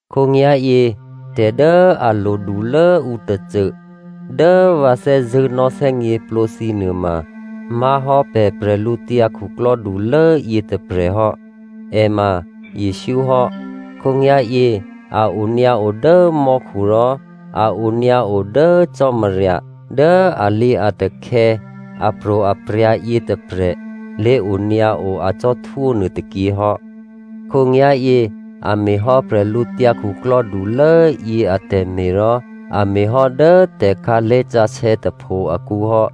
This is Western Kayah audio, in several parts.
Khǒnyá̤yě, tè̤ dố a lodulố ǔ tôcô dố vǎ thè́zṳ̂́ nò̌thè́gněplǒ thǐ nuôma má̤hò́ pè̤ bwídukhulố yětôprè̤ hò́. È ma Jesǔ hò́. Khǒnyá̤yě a onyǎo dố mò́khu rò a onyǎo dố Cò́marya dố alǐatakhè̌, apro̤aprya̤ yětôprè̤ lé̤onyǎo acò́htwó nuôtôkyě hò́. Khǒnyá̤yě a me̤hò́ bwídukhulốyě atè̤me̤, rò a me̤ hò́ dố tè̤khǎlé̤ sǎsè̌ tôpho akǔ hò́.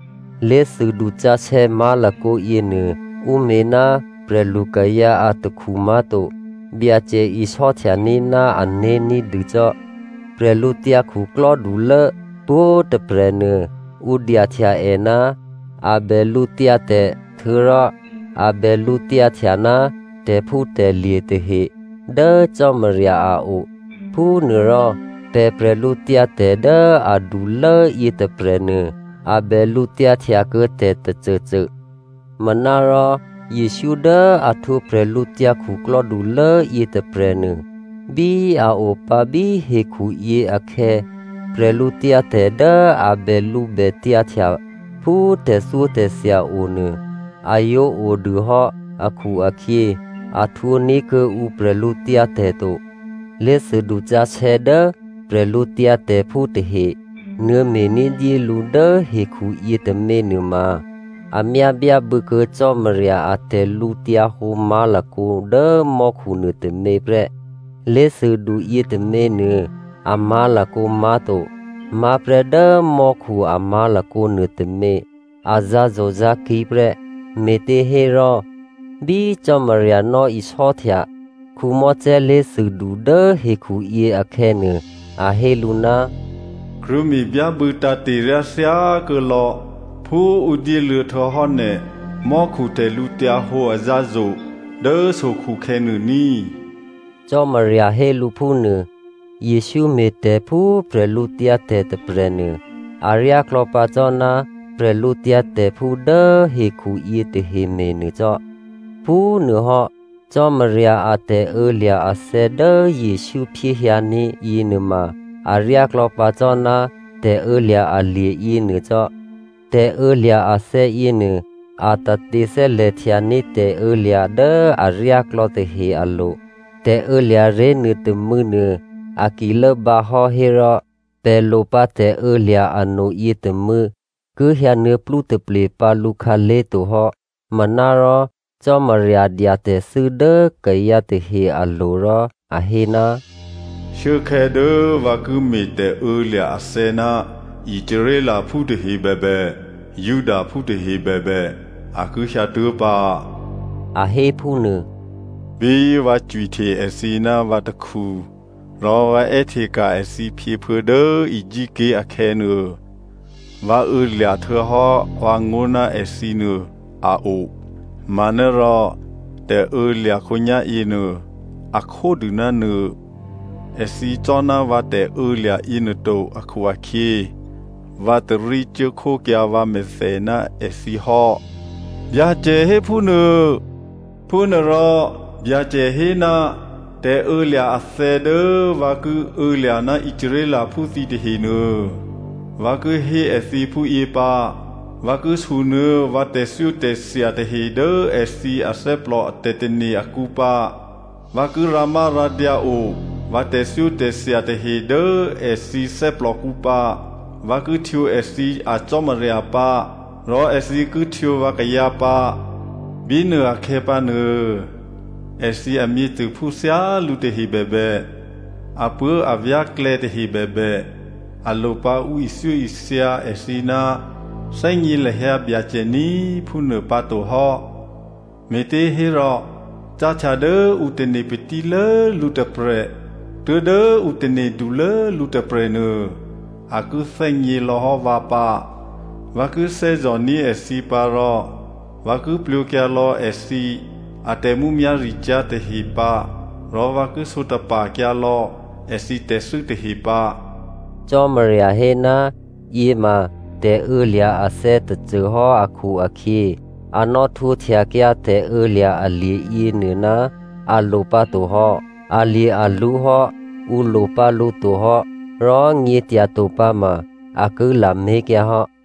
Lé̤thûdu sǎsè̌ má̤lakǒ yěnuô ǔ me̤ ná prè̤lukayǎ atakhu má̤to. Byacè isò́htyaní̤ ná ané̤ ní̤dûcò́. Bwídukhulố pwǒ̤꤮ tôprè̤ nuô, ǔ dyahtya è ná a bè lǔtyǎtè̤ htuô̌rò a bè lǔtyǎhtya ná tè̤phútè̤lye̤ tahe dố Cò́marya a o. Phúnuôrò, pè̤ bwídu dố adulố yětôprè̤nuô, a bè lǔtyǎhtya kuô̌ tè̤ tôcôcô. Manárò Jesǔ dố a htwǒ bwídukhulố yětôprè̤nuô, bí a opǎ bí hekhuyě akhè̌, bwídu dố a bèlǔbètyǎhtya phú tè̤thyótè̤thya onuô, a yǒ odûhò́ akhu-akhyě, a htwǒní̤ kuô̌ǔ bwídu to. Lé̤thûdu sǎsè̌ dố prè̤lǔtyǎtè̤phú tahe nuô̌me̤ ní̤dyé lǔ dố hekhu yětômě nuôma, a myá byábû̌kuô̌ Cò́marya a tè̤lǔhǒdu má̤lakǒ dố mò́khu nuôtômě prè́. Lé̤thûdu yětômě nuô a má̤lakǒ má̤to, má̤prè́ dố mò́khu a má̤lakǒ nuôtômě a zǎ̤zo̤zǎ̤kí̤ prè́. Me̤těhérò, bí Cò́marya nò̌isò́htya Mosè lé̤thûdu dố hekhuyě akhè̌nuô, a hé lǔ, “Krwǒme̤ byábû̌ tǎ̤te̤ryá thyákuô̌lò̌ phú ǔ dyéluô̌ htuô̌hò́ nè̤ mò́khu tè̤lǔhǒdu azǎ̤zo̤ dố sokhukhè̌ nuôní,” Cò́marya hé lǔ phúnuô. Jesǔ me̤tè̤ phú bwídu tôprè̤nuô, aryá klò̌pǎ cò́ ná prè̤lǔtyǎtè̤phú dố hekhu yětahe me̤nuô cò́. Phúnuôhò́, Cò́marya a tè̤ô̌lya̤ athè̌ dố Jesǔ phyéhyǎní̤ yěnuôma aryáklò̌ pǎ cò́ ná tè̤ô̌lya̤ alye̤ yěnuô cò́. Tè̤ô̌lya̤ athè̌ yěnuô, a tate thè́lè̤htyaní̤ tè̤ô̌lya̤ dố aryáklò̌ tahe alo̤. Tè̤ô̌lya̤ ré̤ nuôtômû̌nuô, a ki lốbǎhò́ hérò pè̤ lo pǎ tè̤ô̌lya̤ ano yětômû̌ ki hyǎnuô̌ plútaple pǎ lǔ khǎlé̤to hò́. Manárò Cò́marya dya tè̤thû́ dố akayǎ tahe alo̤ rò a hé, “Shuốkhè̌ dố vǎ ki me̤ tè̤ô̌lya̤ athè̌ ná Israelphú tahe bèbè, Judaphú tahe bèbè a ki hyǎtuố̤pǎ,” a hé phúnuô. “Bí vǎ cwihte èthǐ ná vǎ takhu rò vǎ è́hteka̤ èthǐ phyěphuô̌ dố Egypt ké̤ akhè̌nuô, vǎ ô̌lya̤ htuô̌hò́ vǎngó̤ ná èthǐnuô a o manárò tè̤ô̌lya̤ khǒnyá̤yěnuô, a khódû ná nuô. Èthǐ cò́ná vǎ tè̤ô̌lya̤ yěnuô to akhu-akhyě, vǎ tarí cuốkhókyǎ vǎmèthè ná èthǐ hò́, Byacè héphúnuô. Phúnuôrò, Byacè hé ná tè̤ô̌lya̤ athè̌ dố vǎ ki ô̌lya̤ ná Israelphú thǐ tahenuô, vǎ ki hé èthǐ phúyě pǎ, vǎ ki sunuô̌ vǎ tè̤thyótè̤thya tahe dố èthǐ athè́plò tè̤tane̤ akǔ pǎ. Vǎ ki rǎmárǎdyǎo vǎ tè̤thyótè̤thya tahe dố èthǐ thè́plòkǔ pǎ. Vǎ ki htwǒ èthǐ a Cò́marya pǎ rò èthǐ ki htwǒ vǎkayǎ pǎ. Bínuôakhè̌ pǎnuô, èthǐ amyěcôphú thyálǔ tahe bèbè, apuố̤avyá̤klè̌ tahe bèbè, a lopǎ ǔ ithyóithya èthǐ, ‘Thè́gně lahyǎ Byacè ní꤮’ phúnuô pǎtohò́. Me̤těhérò cáhtya dố ǔ tane̤ patílố lǔ tôprè̤ tuố̤dố ǔ tane̤dulố lǔ tôprè̤nuô, a ki thè́gně lò̌hò́ vǎ pǎ. Vǎ ki thè́zò̤ní̤ èthǐ pǎ rò vǎ ki plwǒkyǎ lò̌ èthǐ atè̤mǔmyá̤ricyá̤ tahe pǎ rò vǎ ki sǒtapa̤kyǎ lò̌ èthǐ tè̤thû́ tahe pǎ.” Cò́marya hé ná yě ma tè̤ô̌lya̤ athè̌ tôcôhò́ akhu-akhyě, a nò̌htwǒhtyakyǎ tè̤ô̌lya̤ alye̤ yěnuô ná a lo pǎtohò́. Alye̤-alwǒ hò́, ǔ lopǎ lǔ tohò́, rò nyě̤tyato pǎma, a ki lamé̤kyǎ hò́.